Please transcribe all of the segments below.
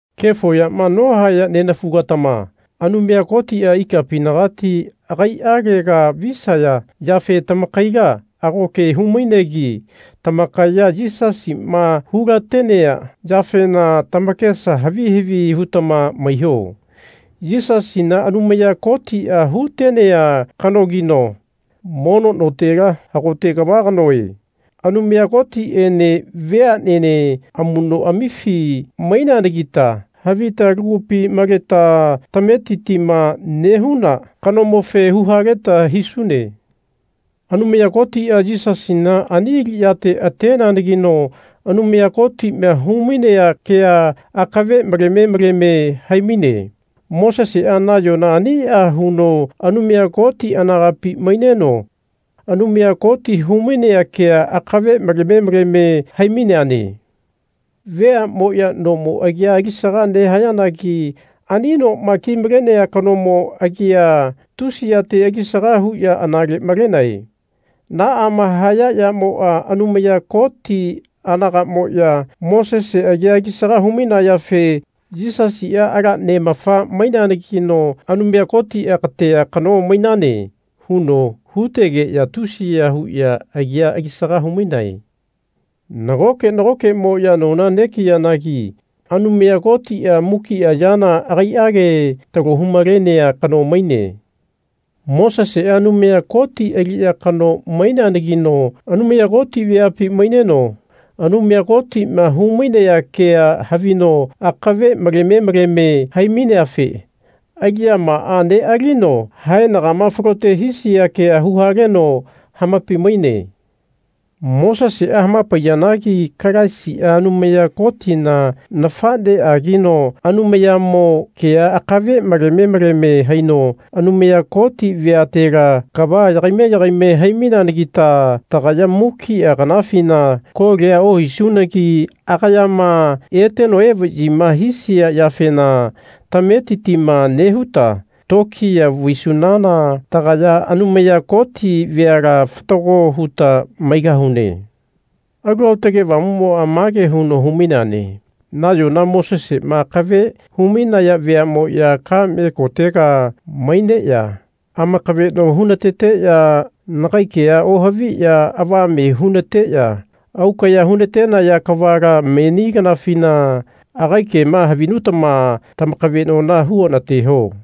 Kefo yama nohaya nenafugatama Anumaya Kotia ikapinagati agaialega visaya yafe tamakaila ago ke hu-mainegi tamakaya Yisasima hulatenea yafena tamakesa havi havi hutama maiho. Yisasina Anumaya Kotia hutenea kanogino mono notela hagote kava kanoe. Anumaya Kotiene veanene amunoamifi maineanagita havita lagupi maleta tametitima nehuna kanomofe huhaleta hisune. Anumaya Kotia Yisasina ani aliyate ateneanagino Anumaya Kotima humainea kea akave maleme maleme haimaine. Mosesea nayona ania huno Anumaya Koti anagapi maineno Anumaya Koti humainea kea akave maleme maleme hai-maineane. Veamoya nomo agia alisaga nehayanagi ani noma kimalenea kanomo agia tusiyate alisaga huya anale malenae. Naama haya yamoa Anumaya Koti anagamoya Mosese agia alisaga hu-mainayafe Yisasia ala neamafa maineanagino Anumaya Kotia Katea kano mainane. huno hutegeya tusiya huya agia alisaga humainae. Nagoke nagokemoya nona negiyanagi Anumaya Kotia mukia yana agaiage talohu-malenea kano maine. Mosesea Anumaya Koti aliya kano maineanagino Anumaya Koti veapi maineno Anumaya Kotima hu-mainea kea havino akave maleme maleme hai-maineafe aliyamaa nealino haenagama falote hisia kea huhaleno hamapai-maine. Mosesea hamapaiyanagi Kalaisia Anumaya Kotina nafaneagino Anumayamo kea akave maleme maleme haino Anumaya Koti veatela kava yagaime yagaime hai-maineanagita tagaya mukia kanafina kolia ohisunagi agayama eteno evayima hisia yafena tametitima nehuta tokiya vaisunana tagaya Anumaya Koti veala fatago huta maigahune. Alu Aotage Avamumoa mage huno hu-maineane Nayona Mosesema akave hu-mainaya veamoya kame kotega maineya amakaveno hunateteya nagai kea ohaviya avame hunateya aukaya hunatenaya kavala meni kanafina agai kema havinutama tamakavenona huonateho.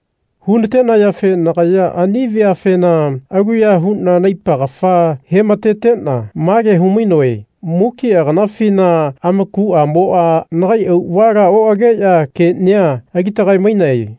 Hunatenayafe nagaya ani veafena aluya huna naipa kafa hematetena mage humainoe Mukia kanafina amakuamoa nagai auavala oageya kenia alitagae-mainae.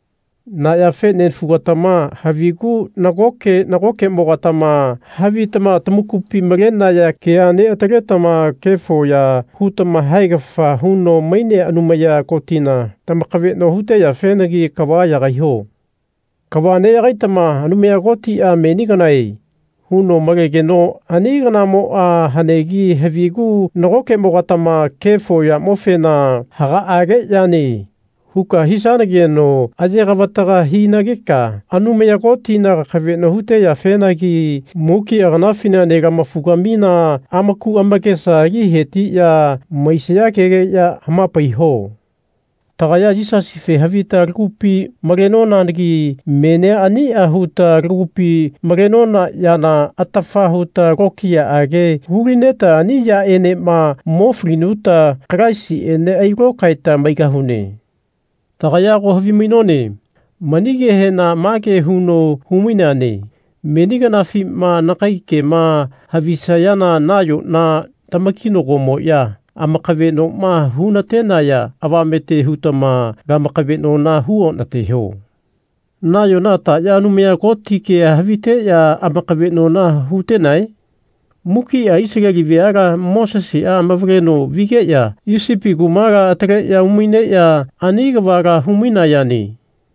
Na yafe nenafugatama havigu nagoke nagokemogatama havitama tamakupi malenaya kea neataletama kefo ya hutama haegafa huno mainea Anumaya Kotina tamakaveno huteyafenagi kava yagaiho. Kava neyagaitama Anumaya Kotia Meni kanae. huno malegeno ani kanamoa hanegi havigu nagokemogatama kefo yamofena Hagaage yane. huka hisanageno ayegavataga hinageka Anumaya Kotina kakaveno huteyafenagi mukia kanafina nelamafugamina amaku amakesa ali hetiya maisaya kegeya hamapaiho. Tagaya Yisasife havita lagupi malenonanagi menia ania huta lagupi malenona yana atafa huta lokiyaage hulineta ani yaenema mo falinuta Kalaisiene ailokaeta maigahune. Tagaya ago havimainone mani kehena mage huno hu-maineane Meni kanafima nagai kema havisayana nayona tamakina-gomoya amakavenoma hunatenaya avamete hutama lamakavenona hu onateho. Nayona taya Anumaya Koti kea haviteya amakavenona hutenae? Mukia Isaleli veala Mosesea amavaleno vigeya Isipi kumala ataleya umaineya ani kavala hu-mainayane.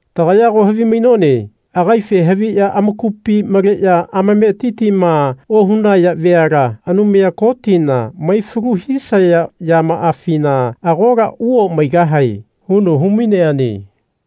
Tagaya ago havimainone agaife haviya amakupi maleya amametitima ohunaya veala Anumaya Kotina maifalu hisaya yamaafina agola uomaigahae huno hu-maineane.